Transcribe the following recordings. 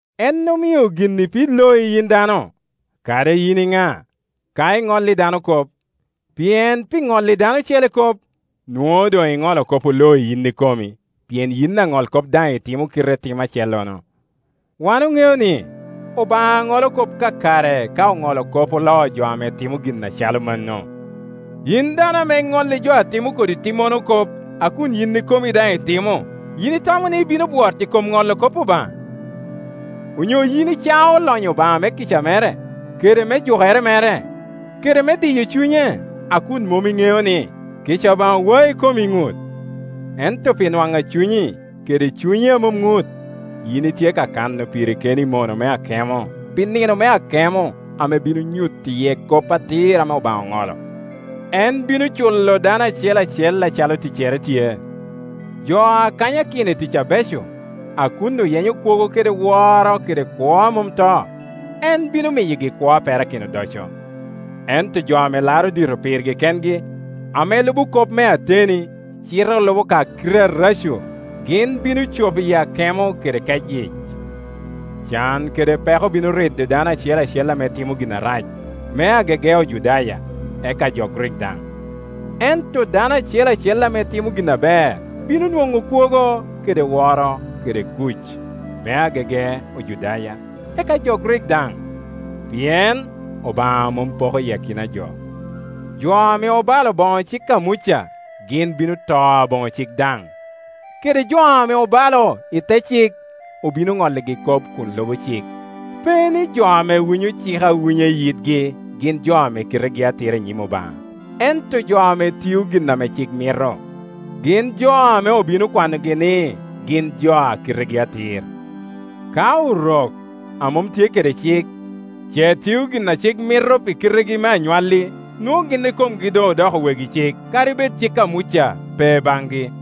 En omio gin ipid loi, yin dano, kadi yin iŋa, ka iŋolli dano kop; pien pi ŋolli dano ocele kop, nwoŋo doŋ iŋolo kop oloi yin ikomi, pien yin aŋolkop daŋ itimo kite tim acellono. Wan oŋeo ni, Obaŋa ŋolo kop kakare ka oŋolo kop oloo jo a timo gin acalo mano. Yin dano ame iŋolli jo a timo kodi timmono kop, a kun yin ikomi daŋ itimo, yin itamo ni ibino bwot i kom ŋolo kop Obaŋa? Onyo yin icao lonyo Obaŋa me kica mere, kede me jukere mere, kede me diyo cunye, a kun mom iŋeo ni, kica Obaŋa wai i kom iŋut? Ento pi nwaŋ a cunyi, kede cunyi a mom ŋut, yin itye ka kano piri keni mono me akemo pi nino me akemo ame bino nyuto iye kop atir ame Obaŋa ŋolo. En bino culo dano acel acel acalo ticcere tye. Jo a kanyakino i tic abeco, a kun oyenyo kwogo kede woro kede kwo a mom to, en bino miyogi kwo a perakino odoco. Ento jo a laro dito pirgi kengi, ame pe lubo kop me ateni, cite olubo ka kite areco, gin bino cop i akemo kede kecyic. Can kede peko bino rido dano acel acel ame timo gin arac, me agege Ojudaya, eka jo Grik daŋ. Ento dano acel acel ame timo gin aber bino nwoŋo kwogo kede woro kede kuc, me agege Ojudaya, eka jo Grik daŋ; pi en Obaŋa mom poko akina a jo. Jo ame obalo boŋo cik a Muca, gin bino to aboŋo cik daŋ; kede jo ame obalo i te cik, obino ŋolligi kop kun lubo cik. Pe ni, jo ame winyo cik awinya i yitgi gin jo ame kitegi atira i nyim Obaŋa; ento jo ame tio gin a cik mito, gin jo ame obino kwanogi, ni gin jo a kitegi atir. Ka Orok, a mom tye kede cik, ce tio gin a cik mito pi kitegi me anywalli, nwoŋo gin ikomgi doŋ odoko wegi cik, kadi bed cik a Muca pe baŋgi.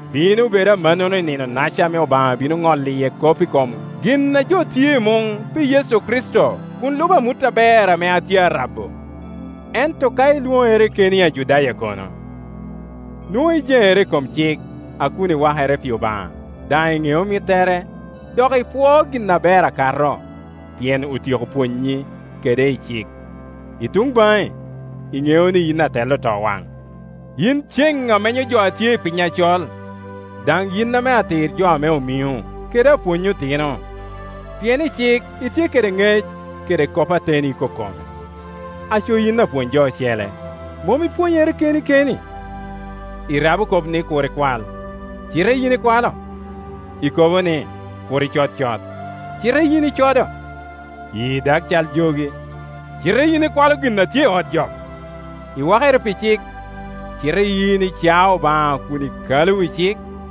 Bino bedo amannono i nino-naca ame Obaŋa bino ŋolo iye kop i kom gin a jo tio i muŋ, pi Yecu Kricito, kun lubo amut aber ame atye arabo. Ento ka ilwoŋere keni Ajudaya kono? Nwoŋo ŋenere i kom cik, a kun iwakere pi Obaŋa, daŋ iŋeo mittere, dok ipwoo gin aber akato, pien otyeko pwonyi kede i cik. I tuŋ baŋi, iŋeo ni yin atel otowaŋ, yin ceŋ a menyo jo a tye i piny acol, daŋ yin ame atir jo ame omiŋo, kede apwony otino, pien i cik itye kede ŋec kede kop ateni ikokome. Aco, yin apwony jo ocele, mom ipwonyere keni keni? Irabo kop ni, “Kur ikwal”, cite yin ikwalo? I kobo ni, “Kur icod cot”, cite yin icodo? Yii dag cal jogi, cite yin ikwalo gin a tye i ot jok? Iwakere pi cik, cite yin icao Obaŋa kun ikalo wi cik?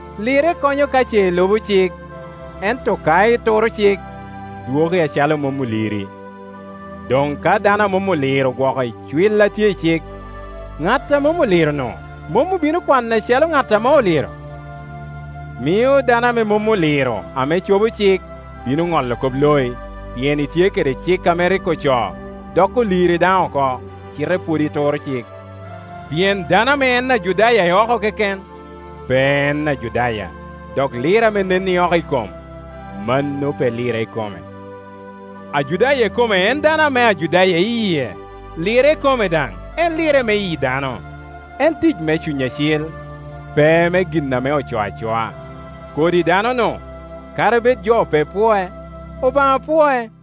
Lirre konyo ka ce ilubo cik, ento ka ituro cik, dwoki acalo mom oliri. Doŋ ka dano a mom oliro ogwoko icwil a tye i cik, ŋat a mom oliro-nu mom obino kwane acalo ŋat ame oliro? Mio dano ame mom oliro, ame cobo cik, bino ŋolo kop loi, pien itye kede cik a rik ocoo, dok oliri daŋ oko, cite pwod ituro cik. Pien dano ame en Ajudaya i oko keken, pe en Ajudaya; dok lirre ame nen i oko i kom, mano pe lirre ikome. Ajudaya ikome en dano ame Ajudaya i yie, lirre ikome daŋ en lirre me yi dano, en tic me Cuny Acil, pe me gin ame ocoo acoa. Kodi dano-nu, kadi bed jo pe pwoe, Obaŋa pwoe.